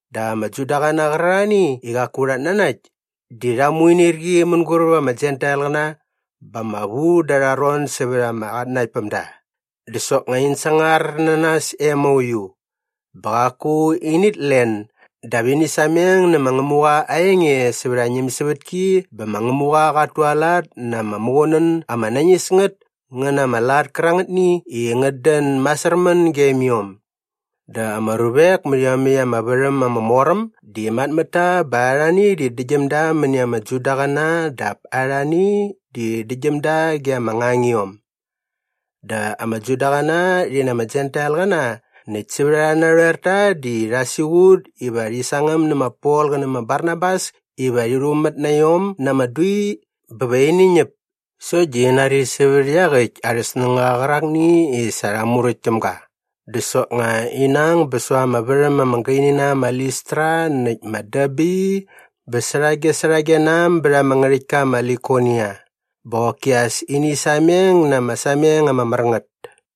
Dap ama Judaqäna qärarhani i qaku rhat nanakt di rha muinirqi mänguräp ama Jentailqäna bä ama vu da arha ron sävät ama qatnanaktpämda. Dä soknga in sangar na nas e mauiu. Bä qaku init len dap ini sameng nä ma Ngämuqa aa enge sävät aa ñämsävätki bä ma Ngämuqa qat tualat na ama muqunän ama nañis ngät ngä na ama lat kärangätni i ngät dän masärmän gem iom. Dä ama ruvek mät iomäkt ama värhäm ama mor äm di mat mät ta bä arhani di däktgyäm da mäni ama Judaqäna dap arhani di däktgyäm da ge ama ngangiom. Dä ama Judaqäna rhi na ama Jentailqäna näkt sävät arhä narhoerta di rha siqut iva rhi sangäm nä ma Pol qä nä ma Barnabas iva rhi rhumät na iom na ama dui bä va ini ñäp sokt di in nari sävät iaqäkt arhä snängaqa qärakni i sa rha muräkt täm ga dä soknga ina ang bä säva ama värham ama gaini na am ma Listra näkt ma Derbe bä särhagesärhage na am bät ama ngärhäktka ma Likonia bä qoki as ini sameng na ama sameng ama mär ngät.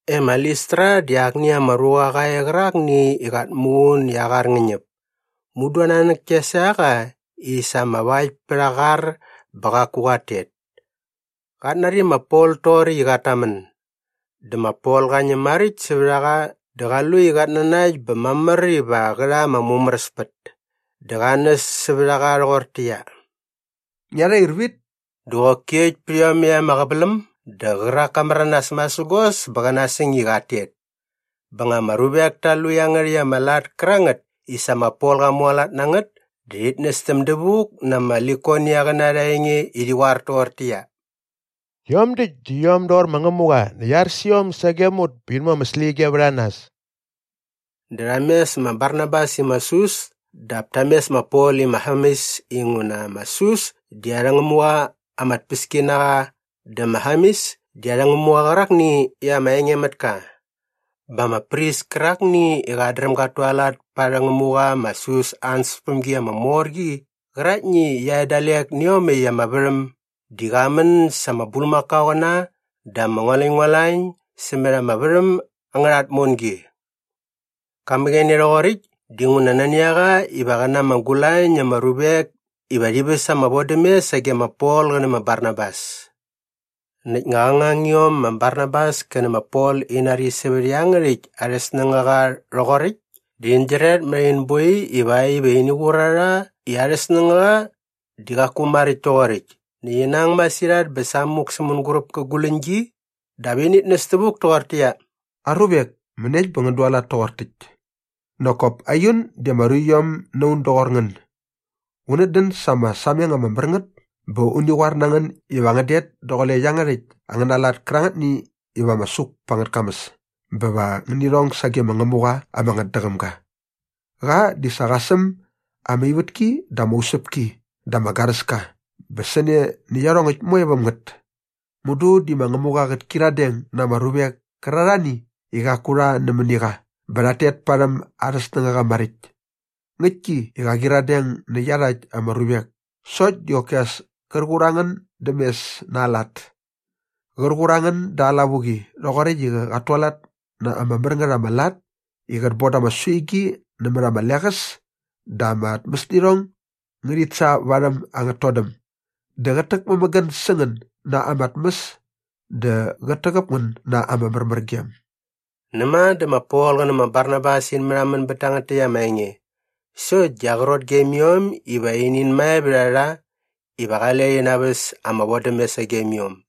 E ma Listra di akni ama ruqa qa e qärakni i qat muqun i aa qar ngä ñäp. Mudu aa nanäk kia sa qa i sa ama vakt pät aa qar bä qaku qat tet. Qat nari ma Pol toqoräkt i qat tamän. Dä ma Pol qa ñäm maräkt sävät a qa dä qa lu i qat nanakt bä mamär iva qä rha ama mumäräspät dä qa näs sävät a qa rhoqortäqyia, “Ngia rhair vit!” Dä qoki äkt pät iomäkt ama qäväläm dä qärak ka märanas masägos bä qä nasäng i qat tet. Ba nga ama ruvek ta lu iangärhäkt ama lat kärangät i sa ma Pol qa mualat na ngät dä rhit nästäm dävuk na ama Likoniaqäna arha enge i rhi qoar toqortäqyia, “Rhiom däkt di iom doqor ma Ngämuqa näkt sa ar sä iom sagem ut bä in mu ama släqyige vät a nas!” Dä rha mes ma Barnabas i ma Sus dap ta mes ma Pol i ma Hermes inguna ma Sus di arhä ngämuqa ama tpäski na qa dä ma Hermes di arhä ngämuqa qärakni i ama engemätka. Bä ama pris kärakni i qat dräm gat tualat pa arhä ngämuqa ma Sus aa ansäspämgi ama mor qi qäraktni i qia e dalek nä iomäkt ama värhäm di qa män sa ama bulmakaoqäna dä ama ngualäñngualañ sämät ama värhäm angärha tmongi. Qa mäqäne rhoqoräkt dinguna nani a qa qä na ama gulañ na ama ruvek iva rhi väs ama vodämes sage ma Pol qä nä ma Barnabas. Näkt nga qä ngangiom ma Barnabas kä nä ma Pol in nari sävät iangärhäkt arhä snängaqa rhoqoräkt dä in gyiret mät in boi ivakt iva ini qur a rha i arhä snängaqa di qaku maräkt toqoräkt näkt ina ang masirhat bä samuk sä mänguräp kä guläñgi dap init näs tävuk toqortäqyia, “Aruvek, mäniekt bä ngän dualat toqor täkt? Nak kop aiun di ama ruiom na un doqor ngän. Unät dän sa ama sameng ama mär ngät bä uni qoar na ngän iva ngän det daqule iangärhäkt angäna lat kärangätni iva ama suk pa angät kamäs bä va ngäni rhong sage ma Ngämuqa ama ngätdäqäm ga. Qa di sa qa säm ama ivätki dä ama usäpki dä ama garäska bä sä ne nä iarhongäkt moe väm ngät. Mudu di ma Ngämuqa qät kyiradeng na ama ruvek kärarhani i qaku rha nämäni qa bä rhat tet parhäm arhä snängaqa maräkt. Ngäktki i qa qyiradeng nä iarhakt ama ruvek sokt di qoki as kär qur a ngän däm mes na aa lat. Qär qur a ngän da aa lavuqi rhoqoräkt i qat tualat na ama mär ngät ama lat i qät boda ama suigi nämät ama leqäs dä ama tmäsnirhong ngärhit sa varhäm angät todäm dä qät täkmämägän sä ngän na ama tmäs dä qät täqäp ngän na ama märmärgem.” Näma dä ma Pol qä nä ma Barnabas in märhamän bät tangät täkt ama enge sokt di aqrot gem iom iva inin mae vät a rha iva qale rhi naväs ama vodämes sagem iom.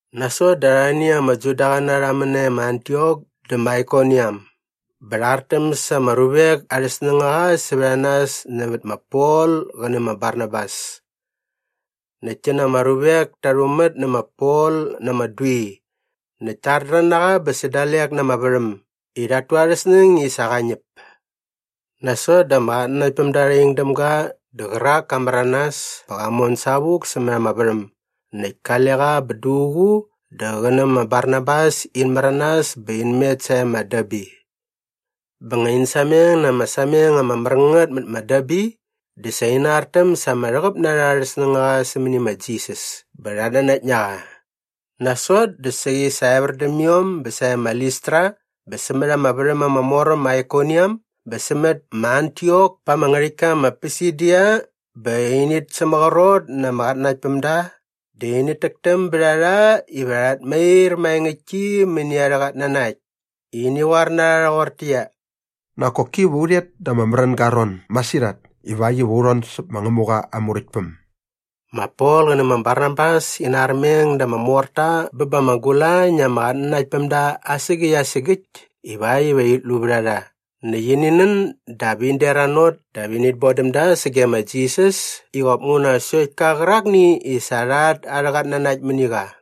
Nasot dä arhani ama Judaqäna rha män nae ma Antiok dä ma Aikoniam bä rha artäm sa ama ruvek arhä snängaqa sävät a nas nävät ma Pol qä nä ma Barnabas. Näkt ti na ama ruvek ta rhumät nä ma Pol na ama dui näkt ta ardrän na qa bä sä dalek na ama värhäm i rhat tu arhä snäng i sa qa ñäp. Nasot dä ama qatnanaktpämda rha ing däm ga dä qärak ka märanas bä qa mon savuk sämät ama värhäm. Näkt kale qa bä duququ dä qä nä ma Barnabas in märanas bä in met sae ma Derbe. Bä nga in sameng na ama sameng ama mär ngät mät ma Derbe dä sa ina artäm sa ama rhäqäp na rha arhä snängaqa sämäni ma Jisas bä rhat nanakt na qa. Nasot dä saqi sa evär däm iom bä sae ma Listra bä sämät ama värhäm ama mor äm ma Aikoniam bä sämät ma Antiok pa ama ngärhäktka ma Pisidia bä init sämaqrot na ama qatnanaktpämda dä init täktäm bät a rha iva rhat mair maengäktki mäni arhä qatnanakt i ini qoar na rha rhoqortäqyia, “Nak koki va u rhet da ama märänga aa ron masirhat ivakt iva u rhon säp ma Ngämuqa aa Muräktpäm.” Ma Pol qä nä ma Barnabas ina armeng da ama morta bä ba ama gulañ na ama qatnanaktpämda asägäkt asägäkt ivakt iva rhit lu vät a rha näkt ini nän dap in deranot dap init bon däm da sage ma Jisas i qop nguna sokt ka qärakni i sa rha at arhä qatnanakt mäni qa.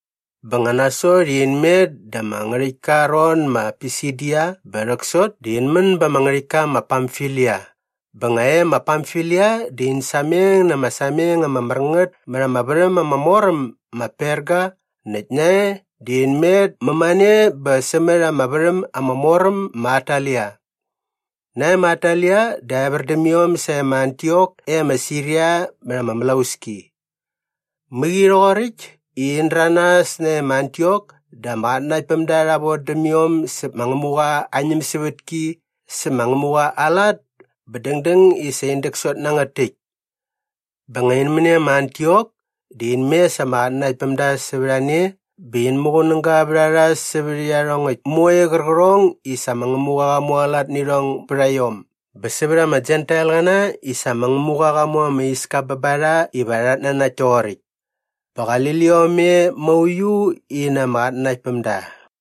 Bä nga nasot i in met da ama ngärhäktka aa ron ma Pisidia bä rhäksot dä in män ba ama ngärhäktka ma Pamfilia bä nga e ma Pamfilia dä in sameng na ama sameng ama mär ngät mät ama värhäm ama mor äm ma Perga näkt nae dä in met mämane bä sämät ama värhäm ama mor äm ma Atalia. Nae ma Atalia dä evär däm iom sae ma Antiok e ma Siria mät ama mlauski. Mäqi rhoqoräkt i in däranas nae ma Antiok dä ama qatnanaktpämda rha vodäm iom säp ma Ngämuqa aa ñämsävätki sä ma Ngämuqa aa lat bä dängdäng i sa in däksot na ngät täkt. Bä nga in män e ma Antiok dä in mes ama qatnanaktpämda sävät a ne bä in muqunäga vät a rha sävät iarhongäkt moe qärqärhong i sa ma Ngämuqa qa mualat nä irhong bät a iom bä sävät ama Jentailqäna i sa ma Ngämuqa qa mu ama iska bä ba rha iva rhat nanakt toqoräkt. Bä qali liom e mauiu in na ama qatnanaktpämda.